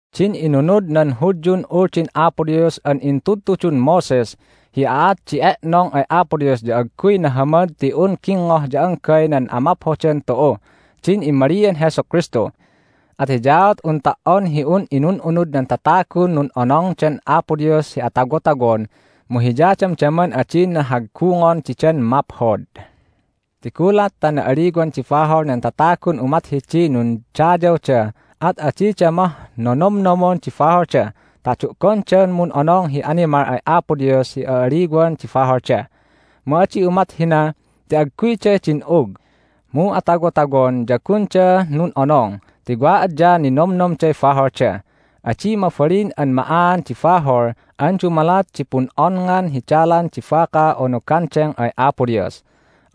Din inunud nan Hudyun Uldin Apo Dios an intudtudun Moses hi aat di e'nong ay Apo Dios ya agguy nahamad ti un gingngoh ya anggay nan amaphodan tu'uh din immalian Jesu Kristu. At hiyaat un ta"on hi un inun'unud nan tatagun nun'onongdan Apo Dios hi atawotawon mu hiya damdaman adina haggungon didan maphod. Ti gulat ta na'aliwan di bahol nan tatagun umat hidiy nundayawda at adida mah nonomnomon di baholda ta du'gondan mun'onong hi animal ay Apo Dios hi a'aliwan di baholda. Mu adi umat hina ti agguyda din'ug, mu atawotawon ya gunda nun'onong ti wa adyaan ninomnomday baholda. Adi mabalin an ma'aan di bahol an dumalat di pun'onngan hi dalan di baka unu gandeng ay Apo Dios.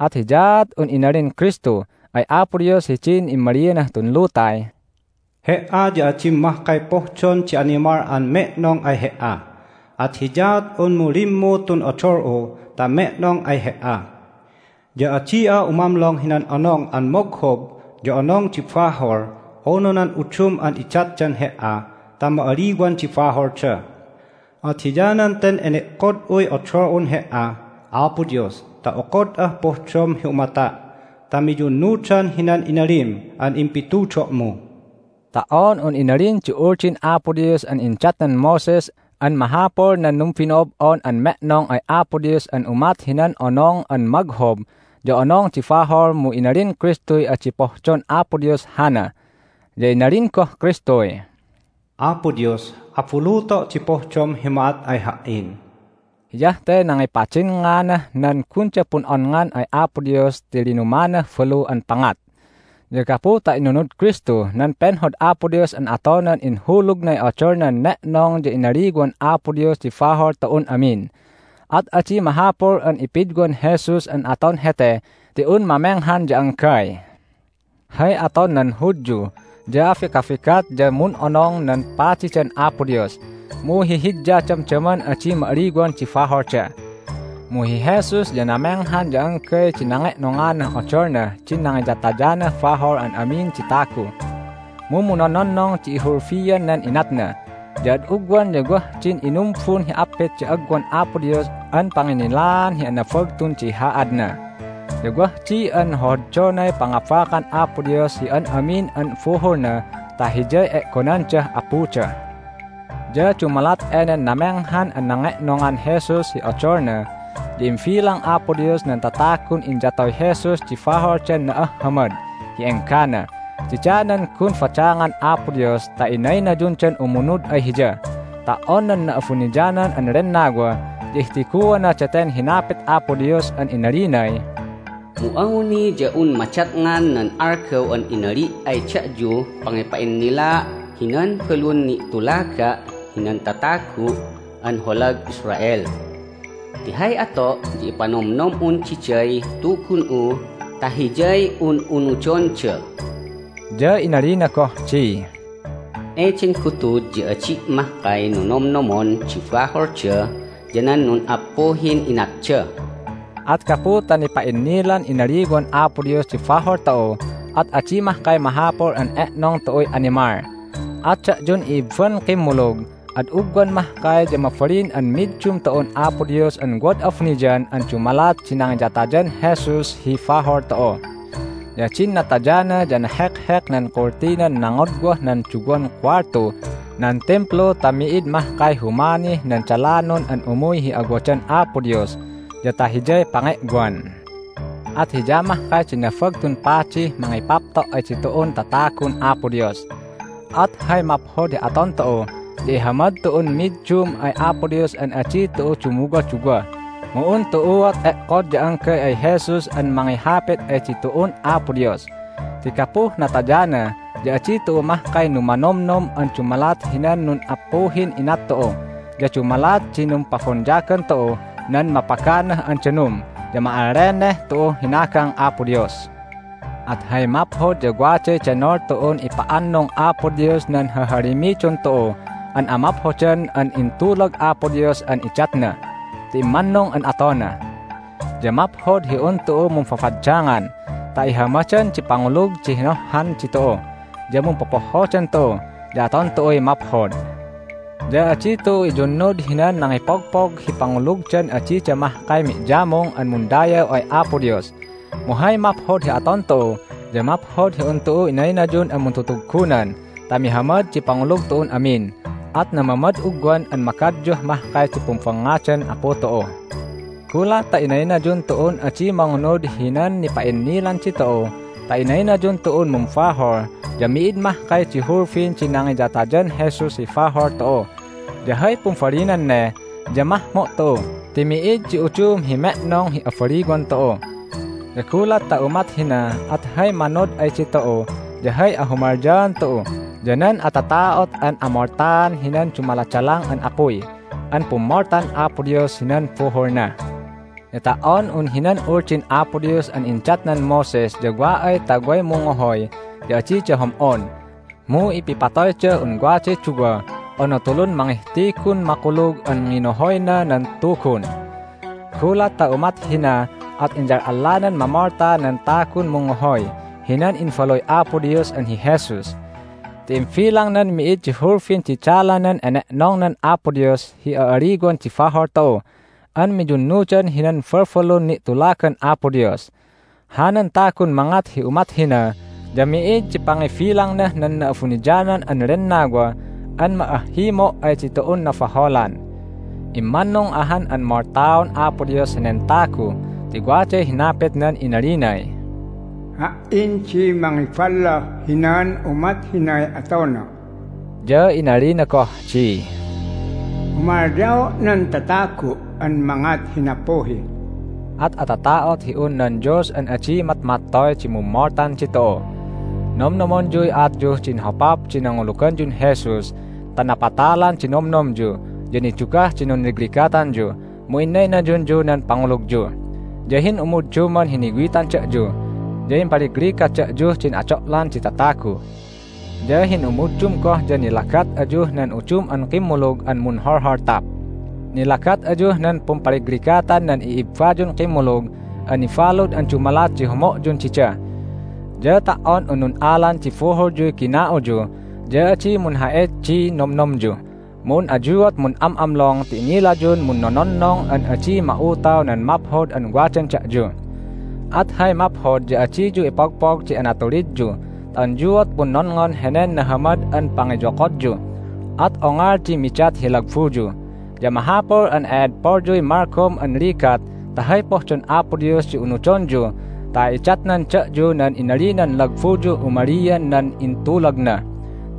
At hiyaat un inalin Kristu ay Apo Dios hidin immalianah tun lutay, "He"a ya adim mahkay pohdon di animal an me'nong ay He"a, at hiyaat unmu limmu tun odol'u ta me'nong ay He"a. Ya adi'a umamlong hinan Onong an Moghob ya Onong di Bahol unu nan udum an idatdan He"a ta ma'aliwan di baholda. At hiyanan ten ene'kod'uy odol'un He"a, Apo Dios, ta okod'ah pohdom hi umata' ta miyunnudan hinan inalim an impitudo'mu." Ta"on un inalin di Uldin Apo Dios an indatnan Moses an mahapul nan numbino'ob'on an me'nong ay Apo Dios an umat hinan Onong an Moghob ya Onong di Bahol mu inalin Kristuy adi pohdon Apo Dios hana. Ya inalin goh Kristuy, "Apo Dios, abuluto' di pohdom hi ma'at ay Ha"in." Hiyah te nangipadinnganah nan gunda pun'onngan ay Apo Dios ti linumanah balu an pangat. Ya gapu ta inunud Kristu nan penhod Apo Dios an atonan inhulugnay odolnan ne'nong ya inaliwan Apo Dios di bahol tu'un amin. At adi mahapul an ipidwan Jesus an aton hete ti un mamenghan ya anggay. Hay aton nan Hudyu ya abigabigat ya mun'onong nan padidan Apo Dios, mu hihidya damdaman adi ma'aliwan di baholda. Mu hi Jesus ya namenghan ya anggay di nange'nonganah odolnah din nangiyatanah bahol an amin di tagu, mu munnononnong di ihulbian nen inatna. Ya ad ugwan ya wah din inumbun hi appit di agwan Apo Dios an panginnilaan hi anabagtun di haadna. Ya wah di an hohoddonay pangabakan Apo Dios hi an amin an buhulna ta Hiyay e'gonandah Apuda. Ya dumalat enen namenghan an nange'nongan Jesus hi odolna ya imbilang Apo Dios nan tatagun inyatoy Jesus di baholdan na'ahhamad hi enggana. Dida nan gun badangan Apo Dios ta inaynayundan umunud ay Hiya. Ta"on nan Na'abuniyanan an Lennawa ya ihtiguana daten hinapit Apo Dios an inalinay, "Mu awni ya un madatngan nan algaw an inali' ay da'yuh pangipa'innilaa' hinan balun ni'tulaga' hinan tatagu' an holag Israel. Ti hay ato' ya ipanomnom'un diday Tugun'u ta hiyay un'unudonda." Ya inalina goh di, "Eden gutud ya adi' mahkay nonomnomon di baholda ya nan nun'appuhin inatda." At gapu ta nipa'innilan inaliwan Apo Dios di bahol tu'u at adi mahkay mahapul an e'nong tu'uy animal. At da'yun i'ibban kimmulug, ad ugwan mahkay ya mabalin an middum tu'un Apo Dios an wad abuniyan an dumalat di nangiyatayan Jesus hi bahol tu'u. Ya din natayana ya nahekhek nan kultinan nangodwah nan duwan kuwaltuh nan Timplu ta mi'id mahkay humanih nan dalanon an umuy hi awadan Apo Dios ya ta Hiyay pange'wan. At Hiya mahkay di Nabagtun Padih mangipapto' ay ditu'un tatagun Apo Dios. At hay maphod hi aton tu'u ya ihamad tu'un middum ay Apo Dios an adi tu'u dumuwaduwa, mu un tu'uat e'kod ya anggay ay Jesus an mangihapit ay ditu'un Apo Dios. Ti gapuh natayana ya adi tu'u mahkay numanomnom an dumalat hinan nun'appuhin inat tu'u. Ya dumalat di numpabonyagan tu'uh nan mapaganah an danum ya ma'alleneh tu'uh hinagang Apo Dios. At hay maphod ya waday denol tu'un ipa'annung Apo Dios nan hahalimidon tu'u an amaphodan an intulag Apo Dios an idatna. Ti immannung an atona. Ya maphod hi un tu'u mumbabaddangan ta ihamadan di pangulug di hinohhan ditu'u, ya mumpopohhodan tu'u, ya aton tu'uy maphod. Ya adi tu'u iyunnud hinan nangipogpog hi pangulugdan adida mahkay mi'yamung an mundayaw ay Apo Dios. Mu hay maphod hi aton tu'u ya maphod hi un tu'u inaynayun an muntutuggunan ta mihamad di pangulug tu'un amin, at namamad ugwan an magadyuh mahkay di pumbangngadan Apu tu'u. Gulat ta inaynayun tu'un adi mangunud hinan nipa'innilan ditu'u ta inaynayun tu'un mumbahol ya mi'id mahkay di hulbin di nangiyatayan Jesus hi bahol tu'u. Ya hay pumbalinan ne ya mahmo' tu'u ti mi'id di udum hi me'nong hi abaliwan tu'u. Ya gulat ta umat hina at hay manod ay ditu'u ya hay ahumalyaan tu'u ya nan atata'ot an amoltaan hinan dumaladalang an apuy an pummoltan Apo Dios hinan buhulna. Ya ta"on un hinan Uldin Apo Dios an indatnan Moses ya wa ay ta way mungngohoy ya adida hom'on, mu ipipatoydah un waday duwa unu tulun mangihtigun makulug an nginohoyna nan Tugun. Gulat ta umat hina at inyal'allanan mamolta nan tagun mungngohoy hinan Imbaluy Apo Dios an hi Jesus. Ti imbilangnan mi'id di hulbin di dalanan ene'nongnan Apo Dios hi a'aliwan di bahol tu'u an miyunnudan hinan balbalun ni'tulagan Apo Dios. Hanan tagun mangat hi umat hina ya mi'id di pangibilangnah nan Na'abuniyanan an Lennawa an ma'ahhimo' ay ditu'un nabaholan. Immannung ahan an moltaon Apo Dios henen tagu ti waday hinapitnan inalinay, "Ha"in di mangiballoh hinan umat hinay atona." Ya inalina goh di, "Humalyao' nan tatagu' an mangat hi nappuhi." At atata'ot hi un nan Dios an adi matmattoy di mummoltan ditu'u! Nomnomonyuy aatyuh din hopap di nanguluganyun Jesus ta napatalan di nomnomyu, ya nidugah di nunligligatanyu, mu innaynayunyu nan pangulugyu. Ya hin'umu'udduman hiniwitan da'yu, ya impaligligat da'yuh din ado'lan di tatagu. Ya hin'umu'uddum goh ya nilagat ayuh nan udum an kimmulug an munholholtap. Nilagat ayuh nan pumpaligligatan nan i'ibbayun kimmulug an nibalud an dumalat di homo'yun dida. Ya ta"on un nun'alan di buhulyuy gina'uyu ya adi munha'it di nomnomyu, mu un ayuat mun'am'amlong ti inilayun munnononnong an adi ma'utaw nan maphod an wadan da'yu. At hay maphod ya adiyu ipogpog di anatulidyu ta unyuat punnonngon henen nahamad an pangiyokodyu, at ongol di midat hi lagbuyu. Ya mahapul an e'edpolyuy malgom an ligat ta hay pohdon Apo Dios di unudonyu ta idatnan da'yu nan inalinan lagbuyuh umalian nan intulagna.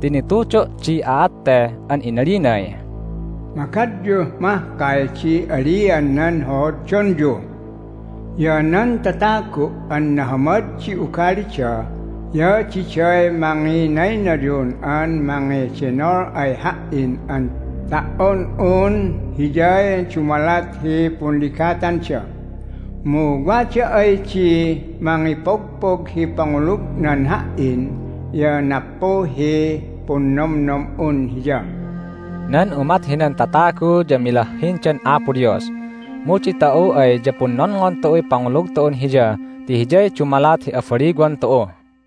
Ti nitudo' di aat te an inalinay, "Magadyuh mahkay di alian nan hohoddonyu. Ya nan tatagu' an nahamad di ugalida ya diday manginaynayun an mangedenol ay Ha"in an ta"on un hiyay dumalat hi punligatanda. Mu wada ay di mangipogpog hi pangulugnan Ha"in ya nappuhiy punnomnom'un hiya." Nan umat hinan tatagu ya milahhindan Apo Dios. Mu ditu'u ay ya punnonngon tu'uy pangulug tu'un Hiya ti hiyay dumalat hi abaliwan tu'u.